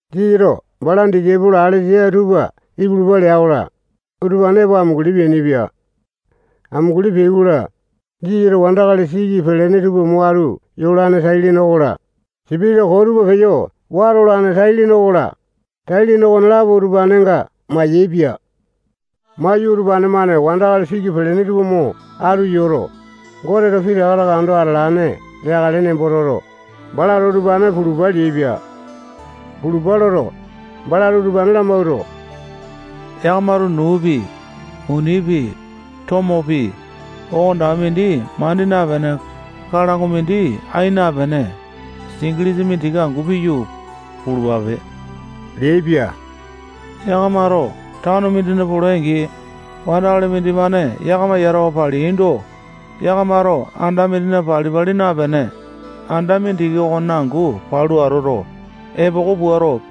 Jisasato balana disaipolo alesa tupa ipulupa lea-kola, utupane epo amunguli peainipia. Amunguli peai-kola, Jisasato wandakali siki pelene tupa mo atu yolane tai-lene okola, sipitisa koo tupa peyo wata olane tai-lene okola, tai-lene okonelapo utupanenga mayaepia. Maiyu, utupane-mane wandakali siki pelene tupa mo atu yoto, Goteto pitaka taka ando atalane leakale nembo toto, balato utupane pulupa leaipia. Pulupa loto, balato utupane lamawuato, yakamato nuupi, munipi, tomopi, okonetaka mindi mandi napene, kalango mindi ai napene, singilisa mindiki angu piyu, pulupape leaipia. Yakamato tano mindina polai-angi, wandakali mindimane yakama yatawa paleaindo, yakamato anda mindina pali-pali napene, anda mindiki okonena angu palu atoto, epoko puato,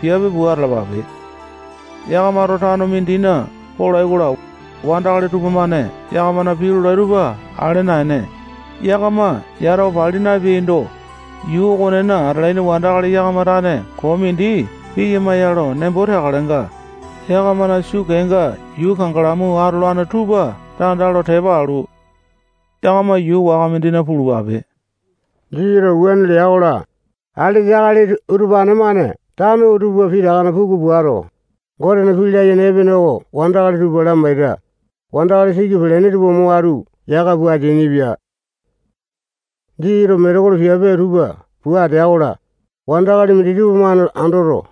piape pua atalapape. Yakamato tano mindina polai-kola, wandakali tupamane yakamana pii lolai tupa ale naene, yakama yatawa pali napeaindo, yuu okonena atalaini wandakali yakama tane koo mindi piyama ya lo nembo teakalenga, yakamana sukeenga yuu kangalamu atolane tupa tanda lo tepa alu, yakama yuu waka mindina pulupape. Jisasato wuane lea-kola, alesa akali utupane-mane tano tupa pitakana puku puato, Gotena pii layene epene oko wandakali tupa lamaita, wandakali siki pelene tupa mo atu yaka pua ateainipia. Jisasato metekolo piape tupa pua atea-kola, wandakali minditupa-mane andoto,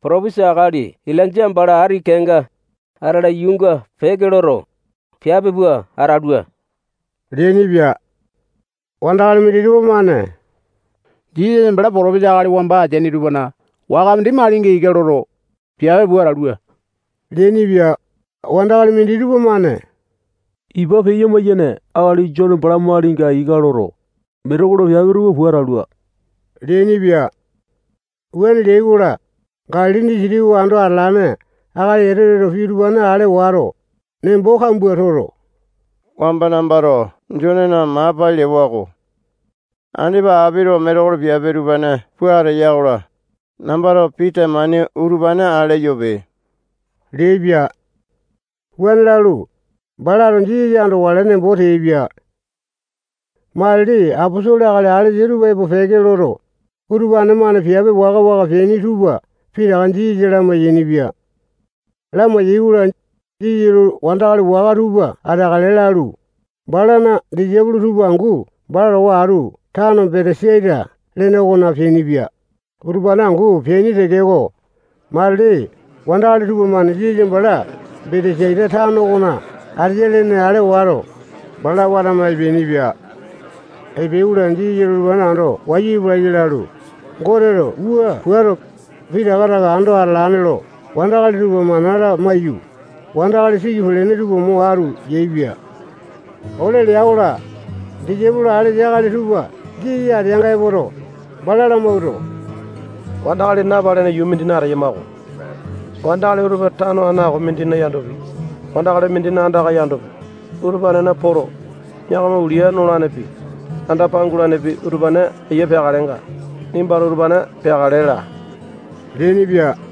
potopesa akali Ilainja bala ati kenga atala, yuunga peke loto, piape pua atalua leainipia. Wandakali minditupa-mane Jisasa bala potopesa akali wamba ateaini tupana waka mindi malinga ika loto, piape pua atalua leainipia. Wandakali minditupa-mane ipa peya-maiyane akali Jone bala malinga ika loto, metekolo piape tupa pua atalua leainipia. Wuane leai-kola, Galili disitiki oko ando atalane akali Etoteto pii utupane ale wato, nembo kambua toto, wamba nambato Jonena maa pai lewa-ko. Andipa apito metekolo piape utupane pua ateya-kola, nambato pii temane utupane ale eyope leaipia. Wuane lalu, balato Jisasa andokale nembo teaipia. Matili aposolo akali alesa tupa epo peke loto, utupane-mane piape waka-waka peaini tupa pitaka Jisasa lamai-yainipia. Lamai-yaikola, Jisasato wandakali waka tupa ateakale lalu, balana disaipolo tupa angu bala towa atu tano Betesaita lene okona peainipia. Utupane angu peaini tekeko, matili wandakali tupamane Jisasa bala Betesaita tano okona ateya lene ale wato, bala watama epeainipia. Epeai-kola, Jisasato utupane ando wayu epelaiya lalu, Goteto wua puato, pitaka taka ando atalane lo wandakali tupa mana lamaiyu, wandakali siki pelene tupa mo atu yaepia. Ole lea-kola, disaipolo alesa akali tupa Jisasa ateanga epoto, bala lamawuato, wandakali napalene yuu mindina ateyama-ko. Wandakali utupa tano aŋako mindina yandopi, wandakali mindina andaka yandopi, utupanena poto, yakama ulia nolanepi, anda pangulanepi utupane ayia peakalenga, nimbato utupane peakale laa leainipia.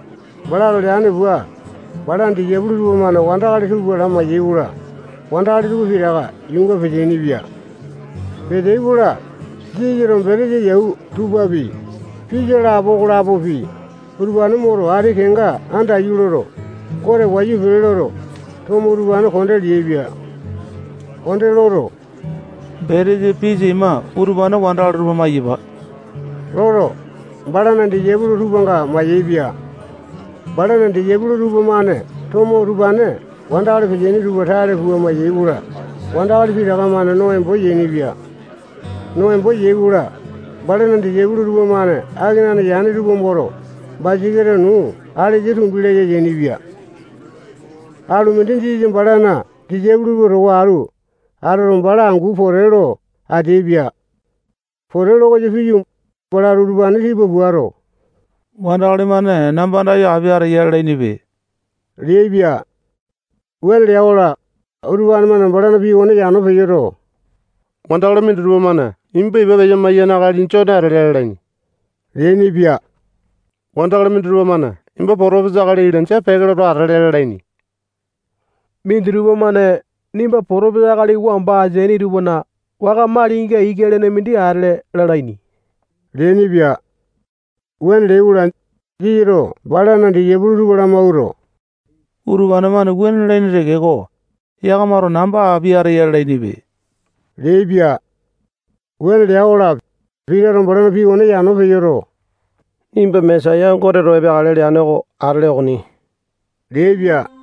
Balato leane pua, balana disaipolo tupamane wandakali tupa lamai-yaikola, wandakali tupa pitaka yuunga peteaini-pia. Peteai-kola, Jisasato betesa yau tupapi, pisa lapo okolapopi, utupane moto, ati kenga andaiyu loto, Gote wayu pele loto, tomo utupane konde leaipia. Konde loto, betesa pisa ima utupane wandakali tupa maiyapa loto, balana disaipolo tupanga mayaepia. Balana disaipolo tupamane tomo utupane wandakali peteaini tupa tale pua mayai-kola, wandakali pitaka-mane no embo yainipia. No embo yai-kola, balana disaipolo tupamane akenane yane tupa moto, basaketa nuu alesa tumbi laya yainipia. Alu mindi, Jisasa balana disaipolo tupa towa atu atoto, bala angu pote lo ateaipia. Pote lo koyo piyu, balato utupane tipa puato, wandakali-mane namba andayo api ateya lalainipe leaipia. Wuane lea-kola, utupane-mane balana pii okone yano peyoto, wandakali minditupa-mane nimba ipa peya-maiyane akali Jone atele lalaini leainipia. Wandakali minditupa-mane nimba potopesa akali Ilainja peke loto atele lalaini. Minditupa-mane nimba potopesa akali wamba ateaini tupana waka malinga ika lene mindi atele lalaini leainipia. Wuane leai-kola, Jisasato balana disaipolo tupa lamawuato, utupane-mane wuane lalaini tekeko, yakamato namba api ateya lalainipe leaipia. Wuane lea-kola, Pitato balana pii okone yano peyoto, nimba Mesaya Goteto epeakale leane oko atele okoni leaipia.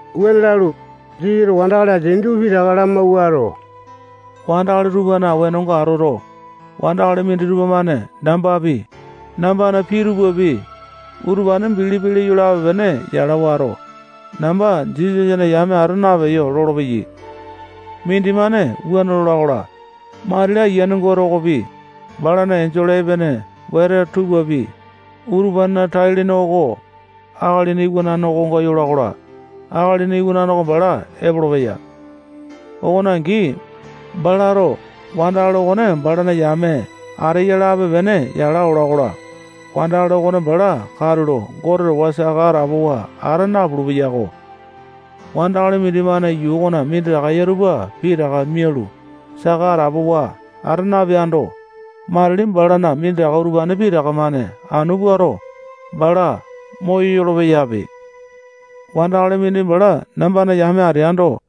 Wuane lalu, Jisasato wandakali ateaini tupa pitaka lamawuato, wandakali tupana wenonga atoto, wandakali minditupa-mane nambapi, nambana pii tupapi, utupane bilipi leyo lape-pene yala wato, namba Jisasana yame ata napeyo lolopeyai. Mindimane wuane lola-kola, matili Ayiane Gote okopi, balana enjole epene wete tupapi, utupanena tai-lene oko Akalina Iwanane okonga yola-kola, Akalina Iwanane oko bala epolopeya. Okone angi, balato wandakali okone balana yame ateya lape-pene yala ola-kola, wandakali okone bala katulo Gote towa saka atapowa ata napulu-peyako. Wandakali mindimane yuu okona minditaka eya tupa pitaka mialu, saka atapowa ata napeando, matili balana minditaka utupane pitaka-mane anu puato, bala moyolo-peyape. Wandakali mindi bala nambana yame ateando,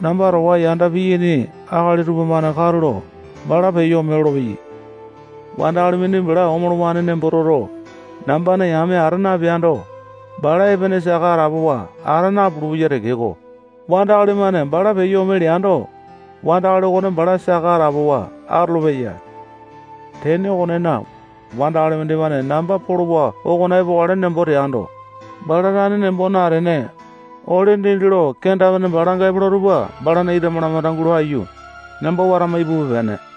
namba towa yanda piyaini akali tupamane katulo bala peyo ome lolopeyai. Wandakali mindi bala omolowane nembo toto, nambana yame ata napeando, bala epene saka atapowa ata napulu-peya tekeko, wandakali mindi bala nambana yame ateya nembo toto, wandakali-mane bala peyo ome leando, wandakali okone bala saka atapowa atolopeya. Tene okonena, wandakali mindimane namba polowa okona epokale nembo teando, bala tane nembo natene, ole dindi lo kenda-pene balanga epola tupa balana ita malamanda gulo aiyu, namba watama ipupe-pene.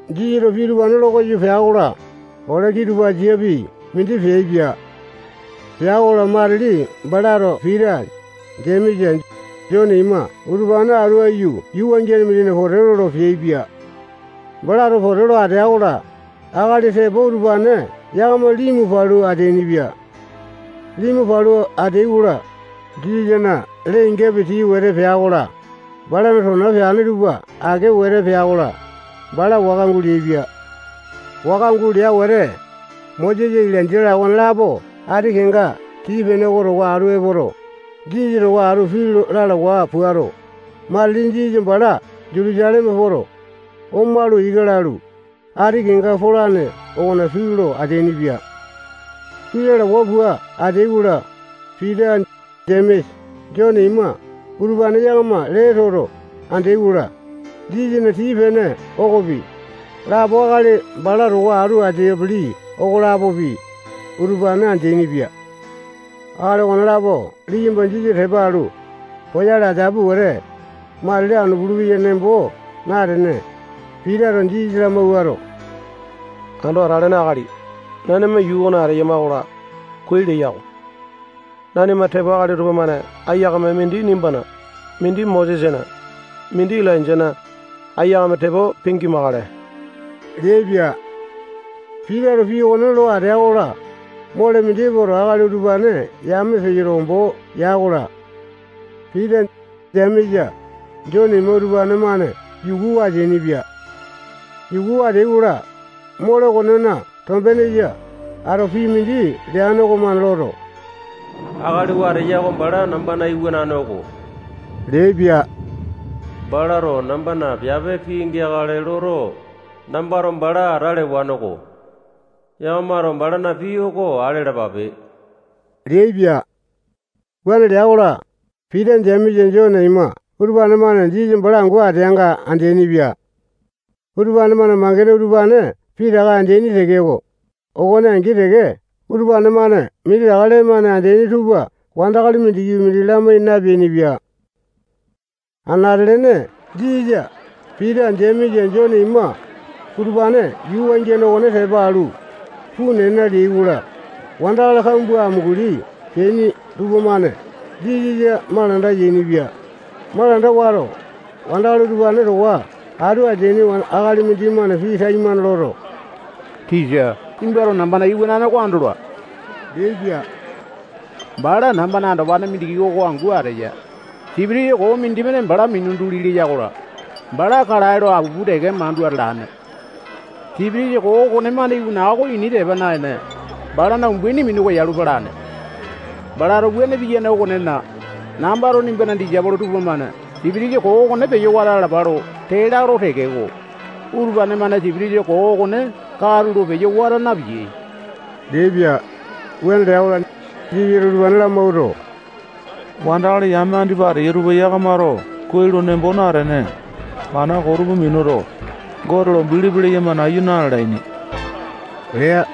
Jisasato pii utupane lo koyo pea-kola, ole kitupasapi mindi peaipia. Pea-kola, matili balato Pita, Jemesa, Jone ima utupane atu aiyu yuu wangiane mindina pote lolo peaipia. Balato pote lo atea-kola, akali tepo utupane yakama limu palu ateainipia. Limu palu ateai-kola, Jisasana lee-ingapi tii wete pea-kola, balana tona peane tupa ake wete pea-kola, bala waka guleaipia. Waka gulea wete, Mosesa, Ilainja-la okonelapo ati kenga tii-pene oko towa atu epoto, Jisasa towa atu pii lalawa puato, matili Jisasa bala Jutusaleme poto, omalu, ika lalu, ati kenga polane okona pii lo ateainipia. Pii lalawa pua ateai-kola, Pita, Jemesa, Jone ima utupane yakama lee toto andeai-kola, Jisasana tii-pene okopi, lapo akali bala towa atu ateapele okolapopi, utupane andeaini-pia. Akali okonelapo liyamba Jisasa tepa alu, poyale ateapi wete, matili anu pulupeya nembo natene, Pitato Jisasa lamawuato, Ando Atalene Akali, nanima yuu okona ateyama-kola, kuai leya-ko. Nanima tepo akali tupamane aiyakame mindi nimbana, mindi Mosesana, mindi Ilainjana, aiyakame tepo pingimakale leaipia. Pitato pii okone lo atea-kola, mole mindi epoto, akali utupane yame peyoto, ombo ya-kola, Pita, Jemesa, Jone ima utupane-mane yukuwa ateainipia. Yukuwa ateai-kola, mole okonena tombenesa ato pii mindi leane okomane loto, akali oo ateya oko bala nambana iwanane oko leaipia. Balato nambana piape pingeakale loto, nambato bala ata lewaneko. Yakamato balana pii oko ale alapape leaipia. Wuane lea-kola, Pita, Jemesa, Jone ima utupane-mane Jisasa bala angu ateanga andeaini-pia. Utupane-mane mangene utupane pitaka andeaini tekeko, okone angi teke utupane-mane minditaka lee-mane andeaini tupa wandakali mindikipi mindi lamai napeainipia. Anate-lene Jisasa, Pita, Jemesa, Jone ima, utupane yuu wangiane okone tepa alu, puu nena leai-kola, wandakali kambua amunguli peaini tupamane Jisasa malanda yainipia. Malanda wato, wandakali utupane towa atu ateane akali mindimane pii taimane loto, tisa, nimbato nambana iwanane oko andola leaipia. Bala nambana andopane mindiki oko angu ateya. Sipitisa koo mindimane bala mina duli leya-kola, bala kalae lo apupu teke mandu atalane. Sipitisa koo okonemane iwana oko ini tepa naene, balana umbaini minu koyalu palane. Balato wuane piyane okonena, nambato nimbana disaipolo tupamane sipitisa koo okone peyo wata alapale lo tee lalo tekeko, utupane-mane sipitisa koo okone katulo peyo wata napiyai leaipia. Wuane lea-kola, Jisasato utupane lamawuato, wandakali yame koo andipa ateyai tupa yakamato kuai lo nembo natene, mana koo tupa minuto, Gote lo bilipi leyama nayu na-lalaini lea.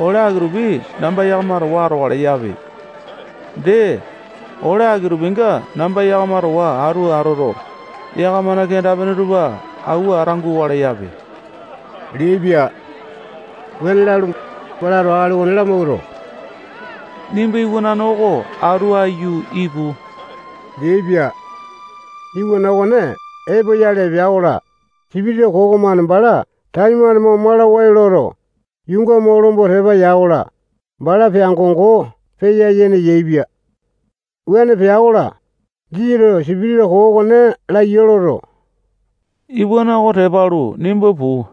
Ole aki-tupi namba yakama towa atokale yape. Dee, ole aki-tupinga namba yakama towa atu atoto, yakamana kenda-pene tupa awua ata gukale yape leaipia. Wuane lalu, balato akali okone lamawuato, nimba iwanane oko atu aiyu ipu leaipia. Iwana okone epoyale epea-kola, sipitisa koo okomane bala taimane mo malawai loto, yuunga mo lomba tepa ya-kola, bala peango-ngo peya-yene yaepia. Wuane pea-kola, Jisasato sipitisa koo okone laya loto, nimba iwana oko tepa alu, puu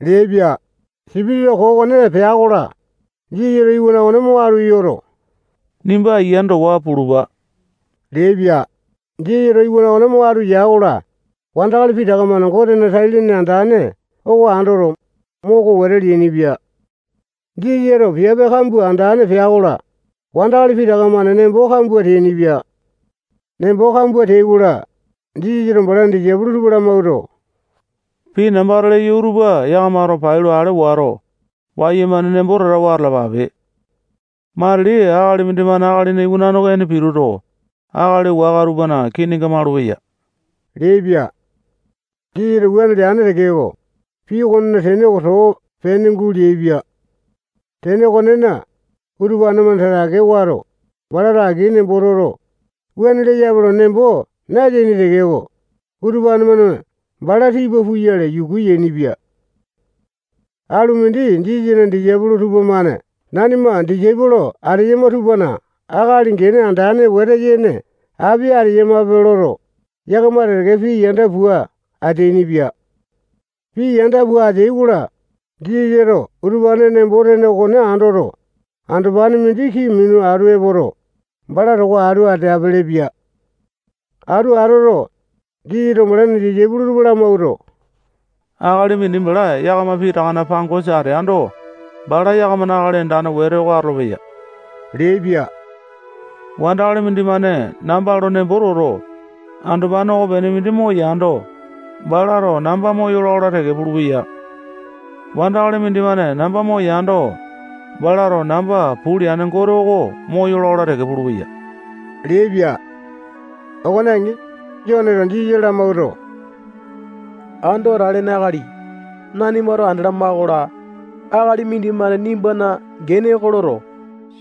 leaipia. Sipitisa koo okone pea-kola, Jisasato iwana okone mo atu yoto, nimba ayiane towa pulupa leaipia. Jisasato iwana okone mo atu ya-kola, wandakali pitaka-mane Gotena tai-lene andane oko andoto, moko wete leainipia. Jisasato piape kambua andane pea-kola, wandakali pitaka-mane nembo kambua teainipia. Nembo kambua teai-kola, Jisasato balana disaipolo tupa lamawuato, pii nambato leyo utupa yakamato pailo ale wato, wayumane nembo tatawa atalapape. Matili akali mindimane Akalina Iwanane oko ene pituto, akali waka tupana kiinga malupeya leaipia. Jisasato wuane leane tekeko, pii okonena tene oko too pene guleaipia. Tene okonena, utupane-mane tatake wato, balato aki nembo toto, wuane leyape nembo nateaini tekeko, utupane-mane bala tipa puyale yuku yainipia. Alu mindi Jisasana disaipolo tupamane nanima disaipolo ateyama tupana akali gene andane wete yene api ateyamape loto, yakama teke-teke pii yanda pua ateainipia. Pii yanda pua ateai-kola, Jisasato utupanena nembo-tene okone andoto, andopane mindi kii minu atu epoto, bala towa atu ateapele-pia. Atu atoto, Jisasato balana disaipolo tupa lamawuato, akali mindi bala yakama pitakana pangosa ateando, bala yakamana akali andane wete oko atolopeya leaipia. Wandakali mindimane namba lo nembo toto, andopane okopene mindi moyando, balato namba moyola-kola teke pulupeya. Wandakali mindimane namba moyando, balato namba puu leane Gote oko moyola-kola teke pulupeya leaipia. Okone angi, Joneto Jisasa lamawuato, Ando Atalene Akali, nanimato andalama-kola, akali mindimane nimbana gene oko loto,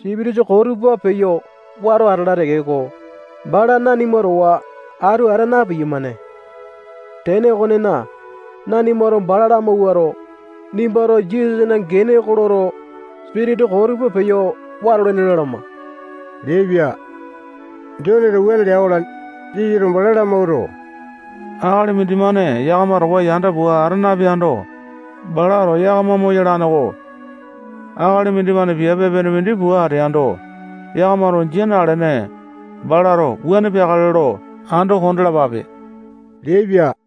sipitisa koo tupa peyo wato atala tekeko, bala nanima towa atu ata na-piyamane. Tene okonena, nanimato bala lamawuato, nimbato Jisasana gene oko loto, sipitisa koo tupa peyo watolene lalama leaipia. Joneto wuane lea-kola, Jisasato bala lamawuato, akali mindimane yakama towa yanda pua ata napeando, balato yakama moyalane-ko. Akali mindimane piape epene mindi pua ateando, yakamato jia nalene, balato wuane peakale lo ando kondalapa leaipia.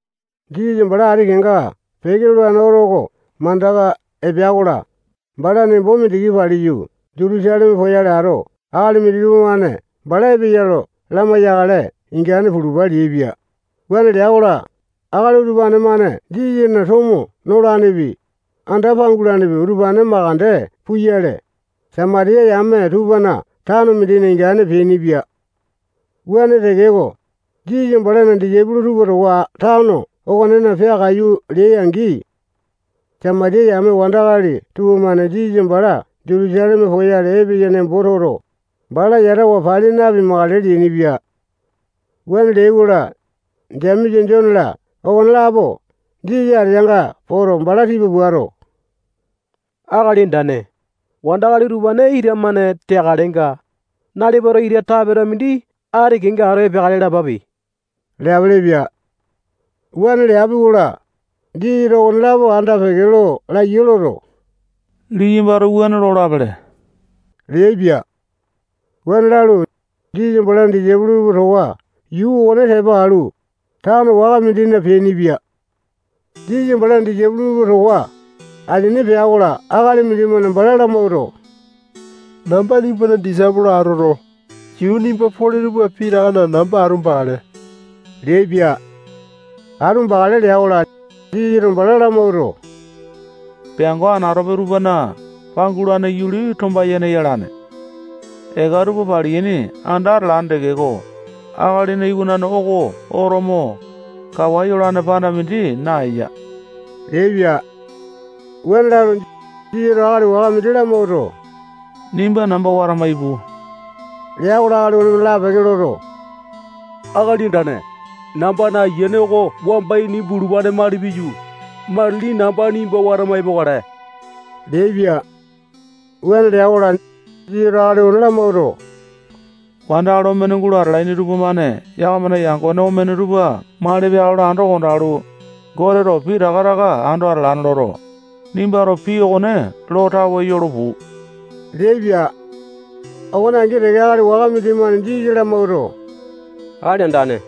Jisasa bala ati kenga peke lolane oto oko mandaka epea-kola, bala nembo mindiki paliyu, Jutusaleme poyale ato, akali minditupa-mane bala epeya lo lamai-yakale ingane pulupa leaipia. Wuane lea-kola, akali utupane-mane Jisasana tomo nolanepi, anda pangulanepi, utupane mandeke puyale, Samatiya yame tupana tano mindina ingane peainipia. Wuane tekeko, Jisasa balana disaipolo tupa towa tano okonena peakaiyu leai-angi, Samatiya yame wandakali utupane-mane Jisasa bala Jutusaleme poyale epeya nembo toto, bala yatawa pali napimakale leainipia. Wuane leai-kola, Jemesa, Jone-la okonelapo Jisasa ateanga poto, bala tipa puato, Akali Andane, wandakali utupane ita-mane teakalenga, nalipato ita tapeta mindi ati kenga ato epeakale lapape leapelepia. Wuane leapi-kola, Jisasa okonelapo anda-peke lo laiya loto, liyambato wuane lolapele leaipia. Wuane lalu, Jisasa balana disaipolo tupa towa yuu okone tepa alu, tano waka mindina peainipia. Jisasa balana disaipolo tupa towa asini peai-kola, akali mindimane bala lamawuato, namba nimbana disaipolo atoto, yuu nimba pole tupa pitakana namba atu bakale leaipia. Atu bakale lea-kola, Jisasato bala lamawuato, peango anatope tupana pangulane yuli tomba-yene yalane. Eka tupa paliyaini anda atalane tekeko, Akalina Iwanane oko oto mo, kawa yolane panda mindi naeya leaipia. Wuane lalu, Jisasato akali waka mindi lamawuato, nimba namba watama ipu lea-kola, akali okonemane lapeke loto, Akali Andane, nambana ayiane oko wamba ini bulupane mali piyu, matili namba nimba watama epokale leaipia. Wuane lea-kola, Jisasato akali okone lamawuato, wandakali omene gulo atalaini tupamane yakamana yangone omene tupa mali peakale lo ando kondalu, Goteto pitaka taka ando atalane loto, nimbato pii okone lo tawe yolo puu leaipia. Okone angi teke, akali waka mindimane Jisasa lamawuato, Akali Andane,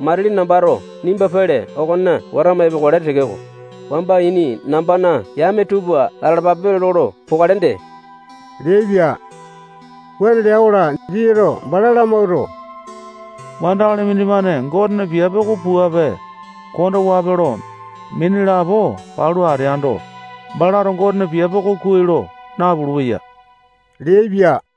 matili nambato nimba pele okona watama epokale tekeko, wamba ini nambana yame tupa atalapape lolo pokale dee leaipia. Wuane lea-kola, Jisasato bala lamawuato, wandakali mindimane Gotena piape oko puape, kondowape lo, mini lapo palu ateando, balato Gotena piape oko kuai lo napulu-peya leaipia.